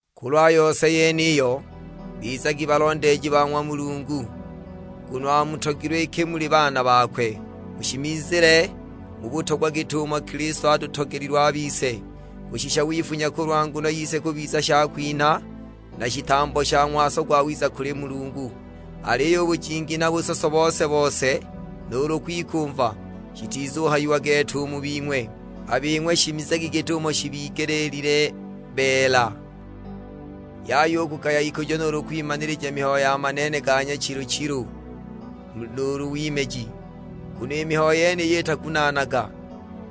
Kulwa yose yeniyo, bizagi balondeeji ba ng'wa Mulungu, nguno amutogilwe iki muli baana bakwe. Mushimizile mu butogwa git'umo Kilisto atutogelilwe a bise, kushisha wifunya kulwa nguno yise kubiza shakwinha, na shitambo sha ng'waso gwawiza kuli Mulungu. Aliyo u bujingi na busoso bose-bose, nuulu kwikumva; shitizuhayiwa gete u mu bing'we. A bing'we shimizagi git'umo shibigelile beela. Yaya u kugaya ikujo nuulu kwimanilija mihayo ya maneene ga nyachilu-chilu nuulu wimeji, nguno i mihayo yeniyi itagunaanaga;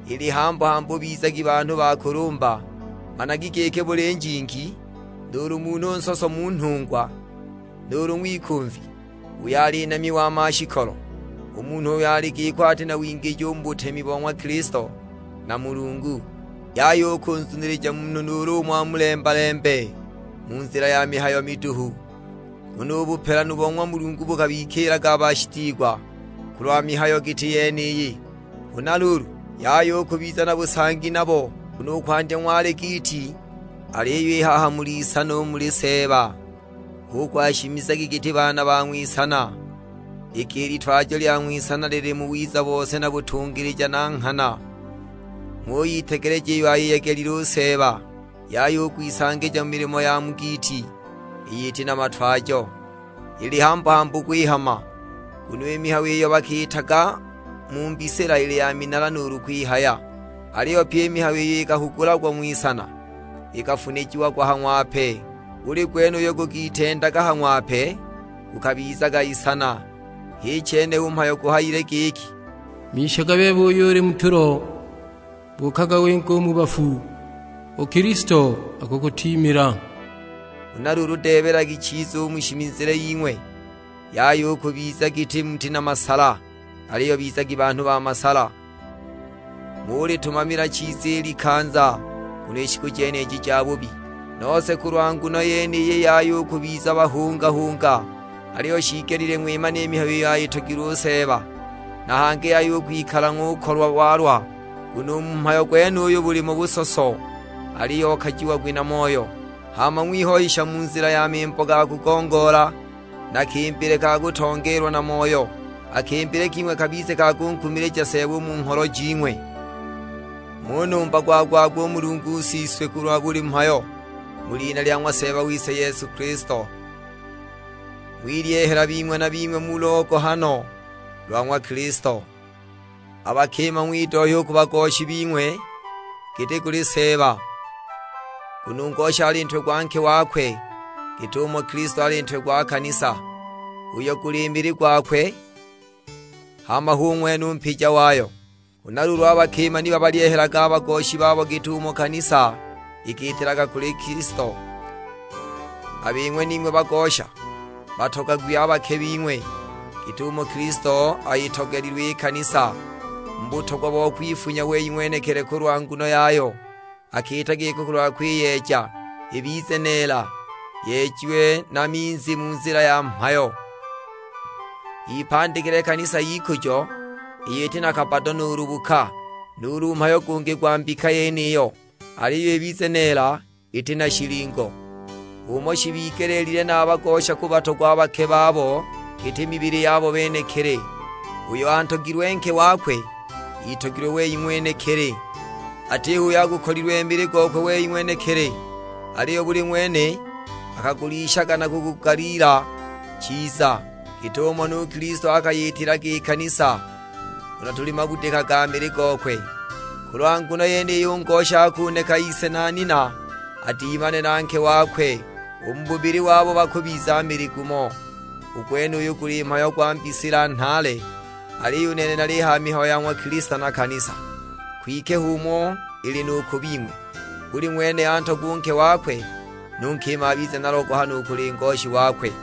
ili hambu-hambu bizagi banhu ba kulumba. Managi giki buli njingi nuulu munhu nsoso mu nhungwa, nuulu ng'wikumvi, (uyo ali namya wa mashikolo), u munhu uyo ali giko ati na wingiji u mu butemi bo ng'wa Kilisto na Mulungu. Yaya u kunzunilija munhu nuulu umo amulemba-lembe mu nzila ya mihayo miduhu, nguno u bupelanu bo ng'wa Mulungu bukabikiilaga a bashitiigwa kulwa mihayo giti yeniyi. Huna luulu, yaya u kubiza na busangi nabo. Nguno i kwandya ng'wali giiti, aliyo i haha muli isana u muli Seeba; hu kuhaya shimizagi giti baana ba ng'wisana. (Iki i litwajo lya ng'wisana lili mu wiza bose na butungilija na nghana). Ng'uyitegeleja iyo ayiyegelile u Seeba. Yaya u kwisangija mu milimo ya mu giiti iyo iti na matwajo, ili hambu-hambu kwihama. Nguno i mihayo iyo bakiitaga mu mbisila ili ya minala nuulu kwihaya. Aliyo pye i mihayo iyo ikahugulagwa ng'wisana, ikafunijiagwa ha ng'wape. Buli gwene uyo gukitendaga ha ng'wape gukabizaga isana, h'i chene u mhayo guhayile giki, "Mishaga bebe uyo uli mu tulo; buukaga winge u mu bafu, u Kilisto akukutiimila." Huna luulu deebelagi chiza u mu shimizile ying'we, yaya u kubiza giti muti na masala, aliyo bizagi banhu ba masala. Ng'ulitumamila chiza i likanza, nguno i shiku jeniji jabubi. Nose kulwa nguno yeniyi yaya u kubiza bahunga-hunga, aliyo shiigelile ng'wimane i mihayo iyo ayitogilwe u Seeba. Na hangi yaya u kwikala ng'ukolwa walwa, nguno u mu mhayo gwenuyo bulimo busoso; aliyo okajiagwi na Moyo. Hama ng'wihoyisha mu nzila ya mimbo ga kugongoola, na kimbile ka kutongeelwa na Moyo. A kimbile king'we kabize ka kunkumilija Seeba u mu ngholo jing'we. Ng'unumba gwa-gwa-gwa u Mulungu Siswe kulwa buli mhayo, mu lina lya ng'wa Seeba wise Yesu Kilisto. Ng'wilyehela bing'we na bing'we mu logohano lwa ng'wa Kilisto. A bakima ng'widohya u ku bagoshi bing'we giti kuli Seeba. Nguno u ngosha ali ntwe gwa nke wakwe, git'umo Kilisto ali Ntwe gwa kanisa, uyo guli mili gwakwe; hama hu ng'wene u Mpija wayo. Huna luulu a bakima ni babalyehelage a bagoshi babo git'umo kanisa ikiitilaga kuli Kilisto. A bing'we ning'we bagosha, batogagwi a bake bing'we, git'umo Kilisto ayitogelilwe i kanisa mu butogwa bo kwifunya wei ng'wenekili kulwa nguno yayo. Akiita giko kulwa kwiyeeja, ibize neela yejiwe na minzi mu nzila ya mhayo, ipandikile kanisa y'ikujo, iyo iti na kabbado nuulu buka, nuulu mhayo gungi gwa mbika yeniyo, aliyo ibize neela iti na shilingo. H'umo shibigelile na a bagosha kubatogwa a bake babo, giti mibili yabo benekili. Uyo antogilwe nke wakwe, itogilwe wei ng'wenekili. Atiho uyo agukolilwe mili gokwe we ng'wenekili, aliyo buli ng'wene akagulishaga na kugugaliila chiza, git'umo nu Kilisto akayitilaga i kanisa, nguno tuli mabudika ga mili gokwe. Kulwa nguno yeniyi u ngosha akuneka ise na nina, adimane na nke wakwe, u mu bubili wabo bakubiza mili gumo. U gwenuyu guli mhayo gwa mbisila nhaale, aliyo u nene nalihaya mihayo ya ng'wa Kilisto na kanisa. Kwike h'umo ili nu ku bing'we, buli ng'wene antogwe u nke wakwe, nu nkima abize na logohano u kuli ngoshi wakwe.